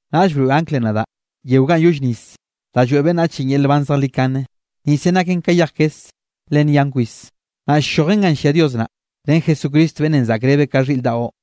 Naꞌll broeꞌ anglenꞌ nadaꞌ yeo ganꞌ yolle nis da lloeꞌ beꞌnnachenꞌ yel nban zejlikane. Nisenꞌ naken ka yej kes le nyan kwis. Naꞌ ll-llojen ganꞌ llia Dios naꞌ, ren Jesucristo beꞌnnenꞌ zaꞌkrebeꞌ ka xhiꞌr daꞌo.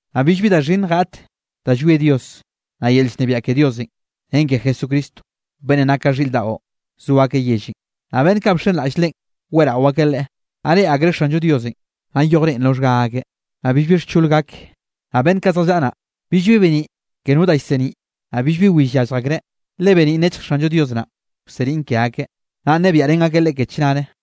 Naꞌ billbi da xhinnj gaꞌt da llwie Dios, naꞌ yel llnebiaꞌ ke Diosenꞌ ren ke Jesucristo, beꞌnnenꞌ nak ka xhiꞌr daꞌo so akeꞌ yellenꞌ. Naꞌ beꞌnn kaꞌ bxenraꞌll Leꞌen weꞌrao akeꞌ Leꞌe. Naꞌ reꞌe akreꞌ Xanllo Diosenꞌ, naꞌ yoj reꞌen roxhga akeꞌ. Naꞌ billbi xchol gake. Naꞌ beꞌnn kaꞌ zjallaꞌa naꞌ, billbi beniꞌ ke no da llseniꞌ, naꞌ billbi will yallj akreꞌ, le beniꞌn nechj Xanllo Dios naꞌn, wseniꞌn ke akeꞌ. Naꞌ nnebiaꞌrén akeꞌ Leꞌe ke chnare.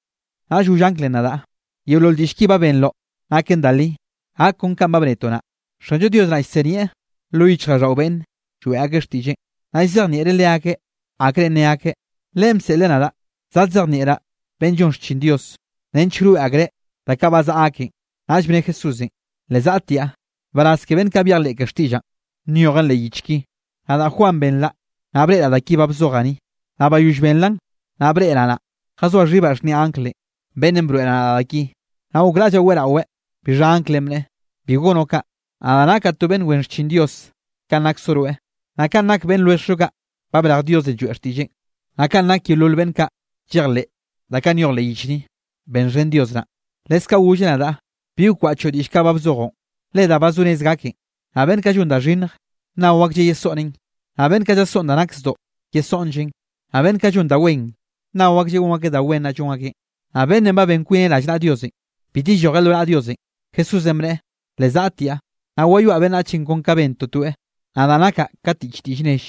Naꞌll goll anglenꞌ nadaꞌ: —Yeolol diꞌll ki ba benroꞌn naken da li, gak kon kanꞌ ba bnetoꞌ naꞌ. Xanllo Dios naꞌ llsenieꞌ lo yichjraꞌlldaꞌo beꞌnne lloeꞌ ak xtiꞌlleꞌn, naꞌ llzejnieꞌreꞌ leakeꞌ akrenꞌ nne akeꞌ, Leꞌen bseꞌleꞌ nadaꞌ zadzejnieꞌraꞌ beꞌnn llon xchin Dios, nench wroeꞌ akreꞌ da kaꞌ ba zaꞌa aken. Naꞌll bne Jesúsenꞌ: —Le zaꞌtiaꞌ. Nbaraz ke beꞌnn kaꞌ byejleꞌ ke xtiꞌllaꞌn, nyojen leꞌ yich ki. Nadaꞌ, Juan, benraꞌ, naꞌ breꞌraꞌ da ki ba bzojaꞌ ni. Naꞌ bayoll benraꞌ, naꞌ breꞌraꞌ naꞌ, jazoaꞌ xhibaꞌ xhniaꞌ anglenꞌ, beꞌnnenꞌ broeꞌ nadaꞌ da ki, naꞌ gokraꞌllaꞌ weꞌraweꞌ. Bixha anglenꞌ bneꞌe: —Bi gonoꞌ kaꞌ, nadaꞌ nakaꞌ to beꞌnn wen xchin Dios kanꞌ naksoꞌ rweꞌ, naꞌ kanꞌ nake beꞌnn lwelljoꞌ kaꞌ ba brej Diosenꞌ lloeꞌ xtiꞌlleꞌn, naꞌ kanꞌ nak yeolol beꞌnn kaꞌ llejleꞌ da kaꞌ nyoj leꞌ yich ni. Benxhen Dios naꞌ. Leskaꞌ golleꞌ nadaꞌ: —Bi wkwaꞌchoꞌ diꞌll kaꞌ ba bzojoꞌn, le da ba zo rez gaken. Naꞌ beꞌnn kaꞌ llon da xhinnj, nnao aklleꞌ yesoꞌneꞌn, naꞌ beꞌnn kaꞌ llasoꞌn da nak zdoꞌ, yesoꞌnlleꞌn. Naꞌ beꞌnn kaꞌ llon da wen, nnao aklleꞌ gon akeꞌ da wen naꞌ llon akeꞌn. Naꞌ beꞌnnenꞌ ba ben kwineꞌ rallnaꞌa Diosenꞌ, bit yellojeꞌ lo naꞌa Diosenꞌ. Jesúsenꞌ bneꞌe: —Le zaꞌtiaꞌ, naꞌ wayoaꞌ beꞌnnach kon ka ba ben totoeꞌ. Nadaꞌ nakaꞌ ka tiꞌch diꞌll nell,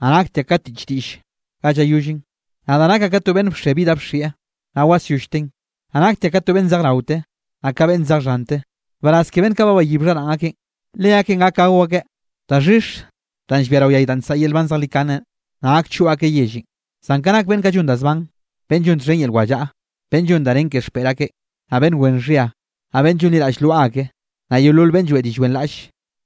naꞌ naktiaꞌ ka tiꞌch diꞌll ganꞌ llayollen, nadaꞌ nakaꞌ ka to beꞌnn bxe bi da bxieꞌ, naꞌ wasyollteꞌn, naꞌ naktiaꞌ ka to beꞌnn zej raote, naꞌ ka beꞌnn zej xhante. Nbaraz ke beꞌnn kaꞌ ba bayib xharaꞌn akeꞌn. Leakeꞌn gak gao akeꞌ daxhix danꞌ llbia rao yay danꞌ nsaꞌa yel nban zejlikanenꞌ, naꞌ gak choꞌ akeꞌ yellenꞌ. Zan ka nak beꞌnn kaꞌ llon da zban, beꞌnn llon txhen yel wallaꞌa, beꞌnn llon da nen ke xpeꞌr akeꞌ, naꞌ beꞌnn wen xhia, naꞌ beꞌnn llonliraꞌll lwaꞌa ake, naꞌ yeolol beꞌnn lloeꞌ diꞌll wenraꞌlle,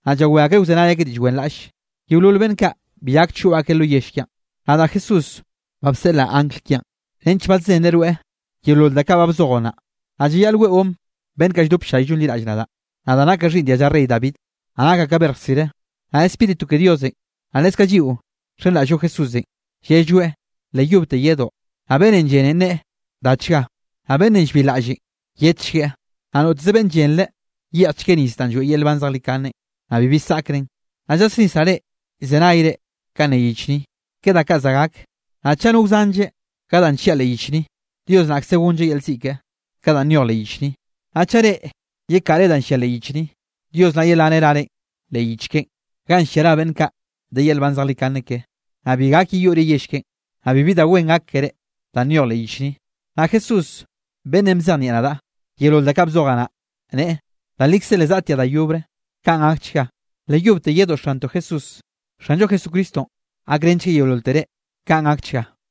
naꞌ llawé akreꞌ wzenay akeꞌ diꞌll wenraꞌlle, yeolol beꞌnn kaꞌ bi gak choꞌ akeꞌ lo yell kiaꞌn. —Nadaꞌ Jesús ba bseꞌlaꞌ angl kiaꞌn, nench badzenreꞌ rweꞌ yeolol da kaꞌ ba bzojoꞌ naꞌ. Naꞌ llayaꞌl weꞌon beꞌnn kaꞌ lldope ll-llay llonliraꞌll nadaꞌ. Nadaꞌ nakaꞌ xhiꞌnn dialla rey David, naꞌ nakaꞌ ka berj rsire. Naꞌ Spíritu ke Diosenꞌ, naꞌ leskaꞌ lliꞌo nxenraꞌll-llo Jesúsenꞌ, llelloeꞌ: —Le yobte yedoꞌ. Naꞌ beꞌnnenꞌ llenenꞌ, nneꞌe: —Dachga. Naꞌ beꞌnnenꞌ llbilraꞌlleꞌ, yedchgueꞌ, naꞌ noteze beꞌnn lleꞌnreꞌ, yeꞌjchgueꞌ nis danꞌ lloeꞌ yel nban zejlikane, naꞌ bibi saꞌkren. Naꞌ llasnisraꞌ reꞌ llzenay kanꞌ ne yich ni, ke da kaꞌ za gak, naꞌ chaꞌ no wzanlle ka danꞌ llia leꞌ yich ni, Dios naꞌkze gonlleꞌ yel ziꞌ keꞌe, ka danꞌ nyoj leꞌ yich ni. Naꞌ chaꞌ reꞌ yekaꞌre danꞌ llia leꞌ yich ni, Dios naꞌ yelaneꞌ rarenꞌ leꞌ yich keꞌen, ganꞌ llia ra beꞌnn kaꞌ de yel nban zejlikane ke, naꞌ bi gak yeyoꞌre yell keꞌen, naꞌ bibi da wen gak keré danꞌ nyoj leꞌ yich ni. Naꞌ Jesús, beꞌnnenꞌ bzejnieꞌ nadaꞌ yeolol da kaꞌ bzojaꞌ naꞌ, neꞌe: —Da likze le zazaꞌtiaꞌ da yobre. Kaꞌn gakchga. Le yobte yedoꞌ Xantoꞌ, Jesús. Xanllo Jesucristonꞌ gakrenchgueꞌ yeololtere. Kaꞌn gakchga.